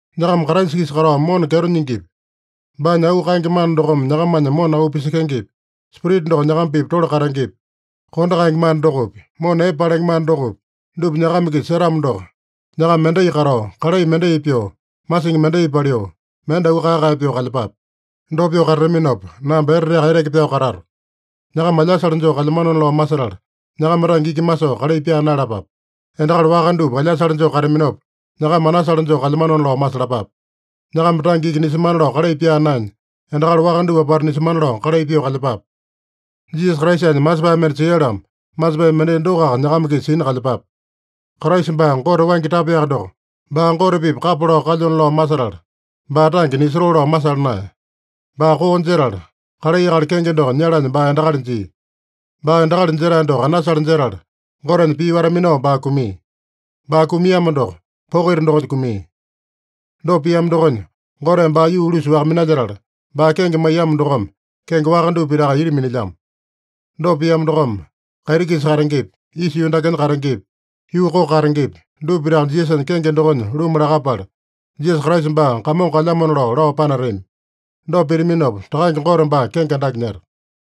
Nyakama Kraisa-kisa katao mona kyeto nyingipi, baanya auu kaenge mana dokome nyakamanya mona auu pisekengepi, Spirita doko nyakama-pipa tole katengepi, kondo kaenge mana dokopi, mona epe palenge mana dokopi, dupa nyakama-kisa setamo doko, nyakama mendai katao, kalai mendai pyoo, masingi mendai paliu, mende auu kae-kae pyoo kalyepape. Dopa pyoo katataminopa, namba eteteaka eteke pyao katato. Nyakama alyasale joo kalyamanona lao masetala, nyakama tange iki masoo kalai pyaa naeyalapape. Endakali waka dupa alyasale joo kataminopa, nyakama anasale joo kalyamanona lao masalapape. Nyakama tange iki nisemana lao kalai pyaa naenya, endakali waka dupa apata nisemana lao kalai pyoo kalyepape. Jisasa Kraisanya masepae mende sia-lamo, masepae mendai dokoaka nyakama-kisa sina kalyepape. Kraisa baa Gote waingi tapaeyaka doko, baa Gote-pipa kapa lao kalyona lao masetala, baa tange nisotoo lao masala naeya. Baa koo jetala, kalai akali kenge doko nyalanya baa endakali jia. Baa endakali jetae doko anasale jetala, Gotenya pii wata-minao baa kumia. Baa kumiamo doko, poko ita dokonya kumia. Dopa piamo dokonya, Goteme baa yuu-ulusa-waka minalyetala, baa kenge maiyamo dokome kenge waka dupa pitaka ita minilyamo. Dopa piamo dokome, kaiti-kisa katengepi, isa yuu dakenya katengepi, yuu koko katengepi, dupa pitaka Jisasanya kenge dokonya luma lakapala, Jisasa Kraisa baa Kamongo kalyamona lao, lao panatami. Dopa pitaminopa, Takange Gote baa kenge andake nyeta.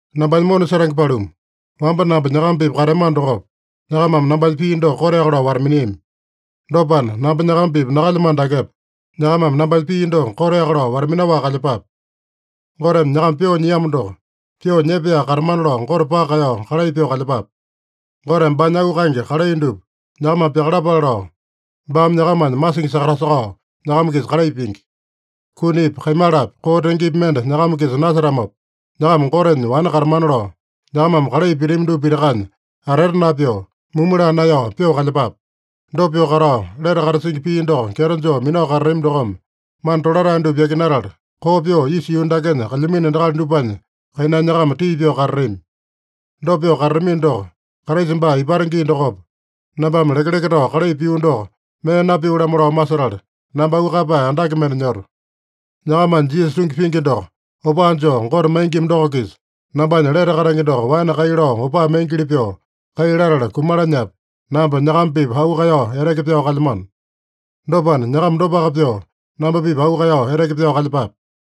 Nambanya mona setenge paluma, wamba namba nyakama-pipa kateamano dokopa, nyakamame nambanya pii doko koteaka lao wata-miniami. Dopana, namba nyakama-pipa nakalyamano dakepa, nyakamame nambanya pii doko koteaka lao wata-minaowaka kalyepape. Goteme nyakama pyoo nyiamo doko, pyoo nyepaeyaka katamana lao Gote paka kaeyao kalai pyoo kalyepape. Goteme baanya auu kaenge kalai dupa nyakamame pyakalapale lao, baame nyakamanya masingi sakatasakao nyakama-kisa kalai pingi. Kunipi, kaimalapi, koo tengepi mende nyakama-kisa nasetamopa, nyakama Gotenya wane katamana lao, nyakamame kalai pitami dupa pitakanya atete napyoo, mumu laa naeyao, pyoo kalyepape. Dopa pyoo katao, lete katasingi pii doko kyeto joo minao katatami dokome, mana tolatae dupa yakinatala koo pyoo isa yuu dakenya kalyamino endakali dupanya kainanya nyakama tii pyoo katatami. Dopa pyoo katatamino doko, Kraisa baa ipata gii dokopa, nambame lekeleke tao kalai pio doko mee napio-lamo lao masetala, namba auu kaeyapae andake mende nyoto. Nyakamanya Jisasa tungi pingi doko opaa joo Gote maingima doko-kisa, nambanya lete katenge doko waene kai lao opaa maingili pyoo kai latala kumalanyapi, namba nyakama-pipa auu kaeyao eteke pyao kalyamano. Dopana, nyakama dopaka pyoo namba-pipa auu kaeyao eteke pyao kalyepape.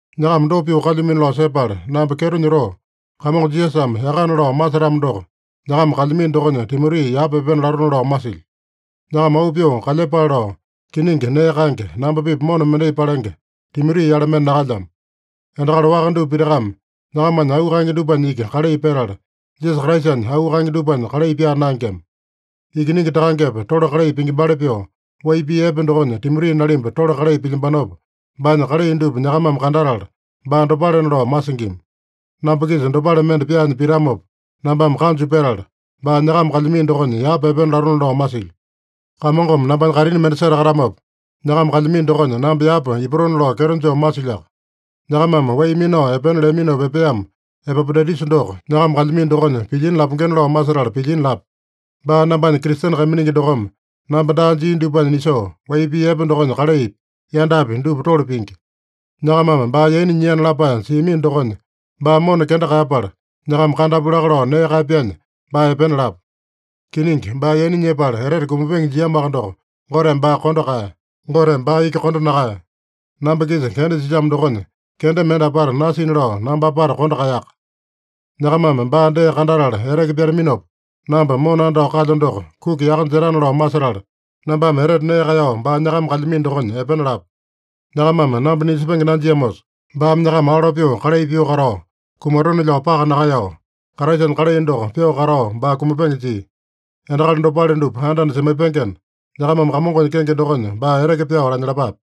Nyakama dopa pyoo kalyumino lao sepala namba kyeto nyotoo, Kamongo Jisasame yakana lao masetamo doko, nyakama kalyamino dokonya Timoti yapa epena latona lao masilyo. Nyakama auu pyoo kalyepale lao kiningi nee kaenge, namba-pipa mona mendai palenge Timoti-yale mende nakalyamo. Endakali waka dupa pitakame nyakamanya auu kaenge dupanya iki kalai petala, Jisasa Kraisanya auu kaenge dupanya kalai pyaa naengema. Ikiningi takangepa tole kalai pingimbali pyoo, wai pii epe dokonya Timoti nalimba tole kalai pilyambanopa, baanya kalai dupa nyakamame kandatala, baa dopalena lao masingima. Namba-kisa dopale mende pyaanya pitamopa nambame kanju petala, baa nyakama kalyamino dokonya yapa epena latona lao masilyo. Kamongome nambanya kaitini mende setakatamopa, nyakama kalyamino dokonya namba yapa ipatona lao kyeto joo masilyoaka. Nyakamame wai minao epena leaminopa epeamo Epapodaitusa doko nyakama kalyamino dokonya pilyina lapengena lao masetala pilyina lapu. Baa nambanya Kristene kaiminingi dokome namba daa jia dupanya nisoo, wai pii epe dokonya kalaipi, yandapi dupa tole pingi. Nyakamame baa yaina nyiana lapae siamino dokonya, baa mona kenda kaeyapala, nyakama kandapu laka lao nee kaeyapyanya, baa epena lapu. Kiningi, baa yaina nyepala etete kumapenge jiamoaka doko, Goteme baa kondo kaeya. Goteme baa iki kondo nakaeya. Namba-kisa kenda silyamo dokonya kenda mende apata nasina lao namba apata kondo kaeyaka. Nyakamame baa dee kandatala eteke pyataminopa, namba mona andao kalyo doko kuki yaka jetana lao masetala, nambame etete nee kaeyao baa nyakama kalyamino dokonya epena lapu. Nyakamame namba nisepenge nanjiamosa, baame nyakama alo pyoo kalai pyoo katao kumatone-lao paka nakaeyao, Kraisanya kalai doko pyoo katao baa kumapenge jia. Endakali dopale dupa anda-anda semaipengena, nyakamame Kamongonya kenge dokonya baa eteke pyao lanyalapape.